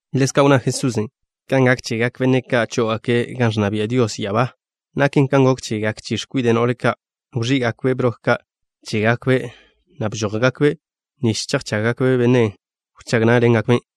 Ḻezka' wnná Jesusen': —Kan gak chegak benne' ka' chó'ogake' gan ẕnna bia' Dios ya'abá, naken kan gok chegak chi x̱kwide' no'le ka'. Wẕí'gakbe' broke ka' chégakbe', na' bžójgakbe' nich chejchággakbe' benne' ẕchag ne'e.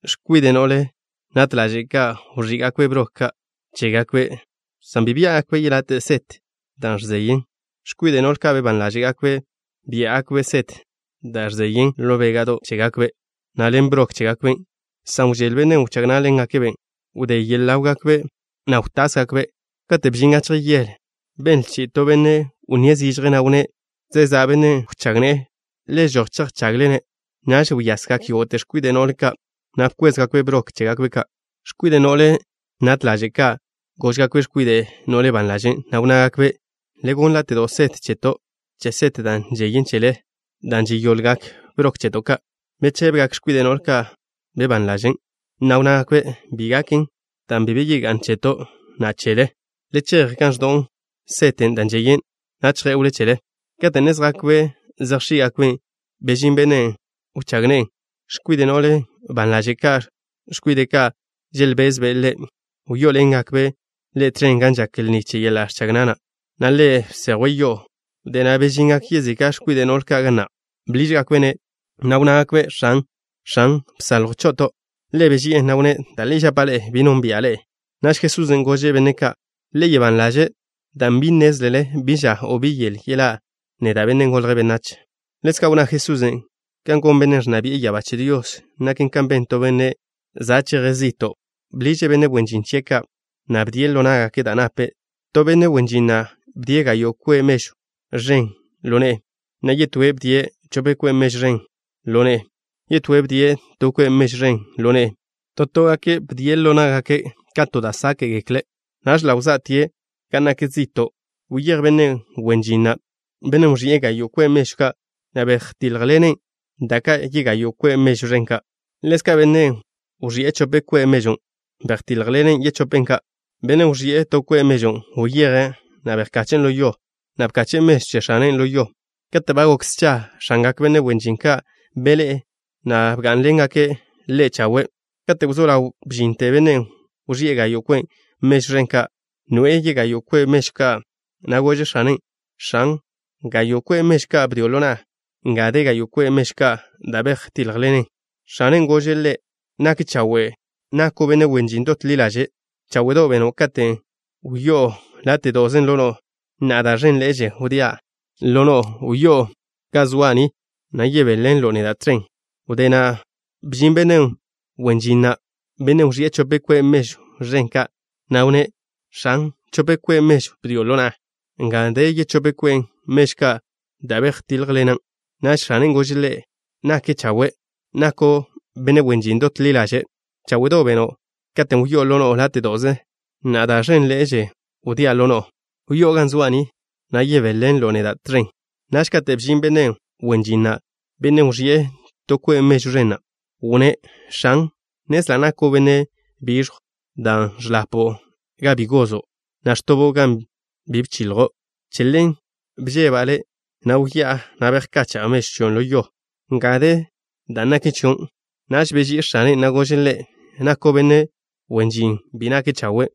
X̱kwide' no'le nat ḻaže' ka' wẕí'gakbe' broke chégakbe' ka', san bi biá'gakbe' yelate' set da' žeyen. X̱kwide' no'le ban ḻaže' ka' biá'gakbe' set da' žeyen ḻo béga'do' chégakbe' ka' ḻen broke chégakbe' ka'. Dan' wžél benne' ẕchag ne'e, wdé yele ḻáwgakbe', na' wtásgakbe'. Kate' bžin gachje yele, benle chi'i to benne' wnníe' zižje, na' wnné': “Za' benne' ẕchag ne'e. Le žoj chejchagle-ne'.” Naž wyasgak yógo'te x̱kwide' no'le ka', na' bkwézgakbe' broke chégakbe' ka'. X̱kwide' no'le nat ḻaže' ka' góžgakbe' x̱kwide' no'le ban ḻaže' ka', na' wnnágakbe': “Le gonn láte'do' set cheto' che set da' žeyen chele, dan' ẕgoḻgak broke cheto' ka'.” Bechébegak x̱kwide' no'le ban ḻaže' ka', na' wnnágakbe': “Bi gaken dan' bi be ga'n cheto', na' chele. Le chej gan ẕdo'w set da' žeyen na' chjé'wle chele.” Kate' ne zjakbe' zejx̱í'gakben', bžin benne' ẕchag ne'e. X̱kwide' no'le ban ḻaže' ka', x̱kwide' ka' želbezbe' ḻe', wyó'oḻengakbe' ḻe' tẕen gan žak lni che yeḻa' ẕchag na', na' ḻa' bséjwte yo'o. Wdé na' bžingak yezika' x̱kwide' no'le ka' ga na'. Bḻížgakbe'-ne', na' wnnágakbe': “X̱an, X̱an, bsaljw cho'oto'.” Ḻe' beži'e, na' wnné': “Da' li žapa' ḻe'e, bi nónbi'a ḻe'e.” Naž Jesusen' gože' benne' ka': —Le gak ban ḻaže', dan' bi nnézlele bi ža, o bi yele yeḻá'a neda', Benne' Golje' Benách. Ḻezka' wnná Jesusen': —Kan gon Bennen' ẕnna bi'e ya'abá che Dios naken kan ben to benne' za' cheje' zi'to'. Bḻiže' benne' wen žin chie' ka', na' bdie' ḻo ná'gake' da' nape'. ’To benne' wen žin na', bdie' gayo' kwe' mežw ẕen ka' ḻo ne'e, na' yetóen' bdie' chope kwe' mežw ẕen ka' ḻo ne'e. Yetóen' bdie' to kwe' mežw ẕen ḻo ne'e. To toen' bdie' ḻo ná'gake' ka da' žákgekle'. Naž ḻa' wzá'tie' gan nak zi'to'. Wyéj benne' wen žin na', bennen' wẕi'e gayo' kwe' mežw ẕen ka', na' bejtíljḻene' da' ka' yegayo' kwe' mežw ẕen ka'. Ḻezka', bennen' wẕi'e chope kwe' mežw ka', bejtíljḻenen' yechope ka'. Bennen' wẕi'e to kwe' mežwn' wyeje', na' bejche'ne' ḻo yo, na' bkache'e mežwn' che x̱ane' ḻo yon'. ’Kate' ba gok scha, x̱angak benne' wen žin ka' beḻé'e, na' bgá'nḻene' ḻégake' chawe'. Kate' wzó ḻaw bžinte bennen' wẕi'e gayo' kwe' mežw ẕen ka', noe'e yegayo' kwe' mežw ka', na' gože' x̱ane': “X̱an, gayo' kwe' mežw ka' bdio' ḻo na'a. Nga de yegayo' kwe' mežw ka' dan' bejtíljḻenan'.” X̱anen' gože' ḻe': “Nak chawe'. Nako' benne' wen žin dot ḻi ḻaže'. Cháwe'do' beno' katen' wyó'o láte'do'ze ḻo no'o. Na'a da' ẕénḻe'eže wdía' ḻo no'o. Wyó'o ga zoa' ni, na' yebéḻenlo' neda' tẕen.” Wdé na' bžin benne' wen žin na', bennen' wẕi'e chope kwe' mežw ẕen ka', na' wnné': “X̱an, chope kwe' mežw bdio' ḻo na'a. Nga de yechóp kwe' mežw ka' da' bejtíljḻenan'.” Naž x̱anen' gože' ḻe': “Nak chawe'. Nako' benne' wen žin dot ḻi ḻaže'. Cháwe'do' beno' katen' wyó'o ḻo no'o láte'do'ze. Na'a, da' ẕenḻe'e wdía' ḻo no'o. Wyó'o ga zoa' ni, na' yebéḻenlo' neda' tẕen.” Naž kate' bžin benne' wen žin na', bennen' wẕi'e to kwe' mežw ẕen na', wnné': “X̱an, nnezla' nako' benne' biẕjw, dan' ẕḻapo' gan bi gozo', na' ẕtobo' gan bi bchiljo'. Che ḻen bžeba' le', na' wyá'a, na' bejkacha'a mežw chion' ḻo yo. Nga de dan' naken chio'.” Naž beží'i x̱ane', na' gože' ḻe': “Nako' benne' wen žin bi nake' chawe',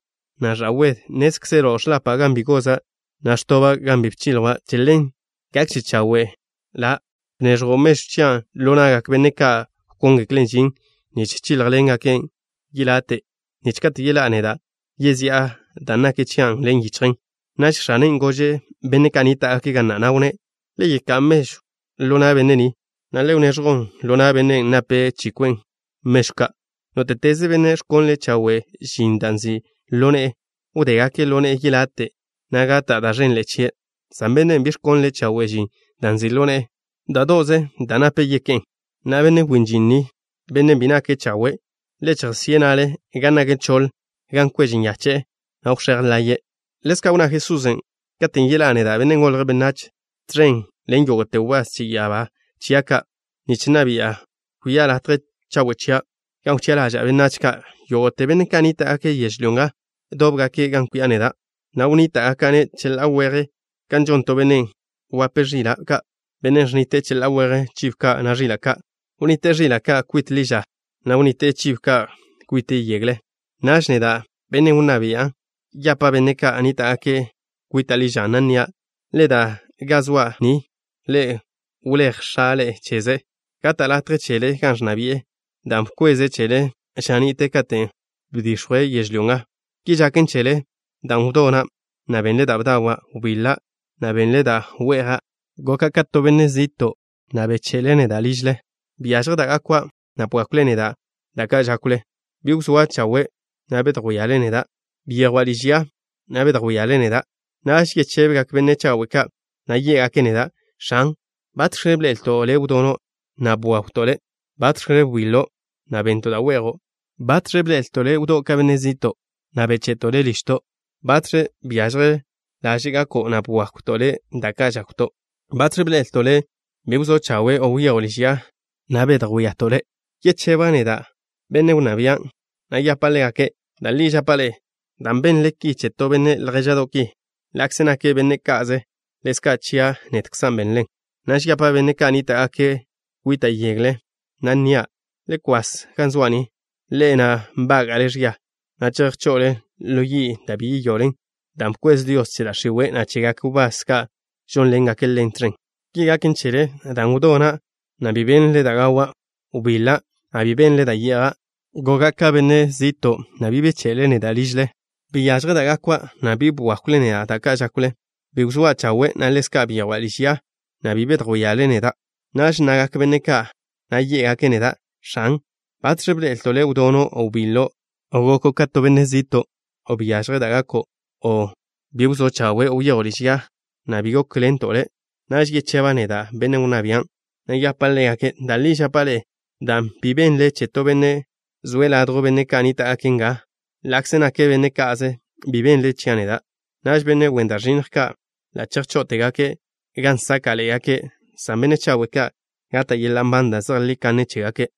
na' ẕa'wede. Nnézkzelo' ẕḻapa' gan bi goza', na' ẕtoba' gan bi bchilja'. Che ḻen, gakže chawe' ḻa' bneẕjo' mežw chian' ḻo na'gak benne' ka' wkóngeklen' žin, nich chíljḻengaken' yelate', nich kate' yeḻá'a neda', yezi'a dan' naken chia' ḻen yichjen.” Naž x̱anen' gože' benne' ka' nníta'gake' ga na', na' wnné': “Le yeká'a mežwn' ḻo na' benne' ni, na' le wneẕjwn ḻo na' bennen' nape' chi kwe' mežw ka'.” Nóte'teze benne' ẕkonle' chawe' žin da' nzi' ḻo ne'e, wdégake' ḻo ne'e yelate', na' gata' da' ẕenže chie', san bennen' bi ẕkonle' chawe' žin da' nzi' ḻo ne'e, da' do'ze da' nape' yeké'n. Na'a, benne' wen žin ni, benne' bi nake' chawe', le chejžo'ne' na'le gan nak choḻ, gan kweže nyache'e, na' wx̱éj laye'e. Ḻezka' wnná Jesusen': —Katen' yeḻá'a neda', Benne' Golje' Benách, tẕen ḻen yógo'te wbás che ya'abá chia' ka', nich nna bi'a, kwi'a ḻo latje chawe' chia', gan wchi'a ḻaža'a benách ka'. Yógo'te benne' ka' nníta'gake' yežlyó nga dóbgake' gan kwi'a neda', na' wnníta'gaka'-ne' cheḻá'a weje kan žon to benne' wape ẕila' ka', benne' ẕnnite'e cheḻá'a weje chibo ka', na' ẕila' ka'. Wnnite'e ẕila' ka' kwite' ḻi ža, na' wnnite'e chibo ka' kwite' yegle. Naž, neda', benne' wnná bian', yapa' benne' ka' nníta'gake' kwita' ḻi ža, na' nnia': “Le da ga zoa' ni, ḻe'e wléj X̱a' ḻe'e cheze'. Gata' latje chele gan ẕnna bi'e, dan' bkweze' chele ža ni'te katen' bdix̱jwe' yežlyó nga. Ki žaken chele dan' wdona', na' bennle da' bdawa'. Wbiḻa', na' bennle da' we'ja'. Goka' ka to benne' ẕde' zi'to', na' wlo'le neda' ližle. Byažje da' gakwa', na' bwákwle neda' da' ka' žákwle. Bi wzóa' chawe', na' bedjwíale neda'. Byejwa' liž ya, na' bedjwíale neda'.” Naž yechébegak benne' chawe' ka', na' yé'gake' neda': “X̱an, ¿batx̱ bḻe'elto' Le' wdono', na' bwawto' Le'? ¿Batx̱ wbiḻo', na' bennto' da' we'jo'? ¿Batx̱ bḻe'elto' Le' bejdío' zi'to', na' wlo'to' Le' ližto'? ¿Batx̱ byažje laže' gako', na' bwákwto' Le' da' ka' žákwto'? ¿Batx̱ bḻe'elto' Le' bi wzó' chawe', o wyejo' liž ya, na' bedjwíato' Le'?” Yecheba' neda', benne' wnná bian', na' yapa' ḻégake': “Da' li žapa' ḻe'e, dan' benle ki che to benne' ljéža'do' ki, ḻa'kze nake' benne' ka'ze, ḻezka' chia' nedkza' benlen'.” ’Naž yapa' benne' ka' nníta'gake' kwita' yegle, na' nnia': “Le kwas ga zoa' ni, ḻe'e na' nbága'le ẕia, na' chejchazle ḻo yi', da' bi yeyoḻen, dan' bkwez Dios che da' x̱iwe', na' chegak wbás ka' žónḻengaken ḻen tẕen. Ki gaken chele dan' wdona', na' bi bennle da' gawa'. Wbiḻa', na' bi bennle da' ye'ja'. Goka' ka benne' ẕde' zi'to', na' bi wlo'le neda' ližle. Byažje da' gakwa', na' bi bwákwle neda' da' ka' žákwle. Bi wzóa' chawe', na' ḻezka' byejwa' liž ya, na' bi bedjwíale neda'.” Naž nnagak benne' ka', na' yé'gake' neda': “X̱an, ¿batx̱ bḻe'elto' Le' wdono', o wbiḻo', o goko' ka to benne' ẕde' zi'to', o byažje da' gako', o bi wzó' chawe', o wyejo' liž ya, na' bi gókḻento' Le'?” Naž yecheba' neda', benne' wnná bian', na' yapa' ḻégake': “Da' li žapa' ḻe'e, dan' bi be benle che to benne' zoe' ladjw benne' ka' nníta'gake' nga, ḻa'kze nake' benne' ka'ze, bi be benle chia' neda'.” Naž benne' wen da' ẕinnj ka' ḻa' chejcháztegake' gan sáka'ḻe'egake', san benne' chawe' ka' gata' yeḻa' nban da' zejlí kanne chégake'.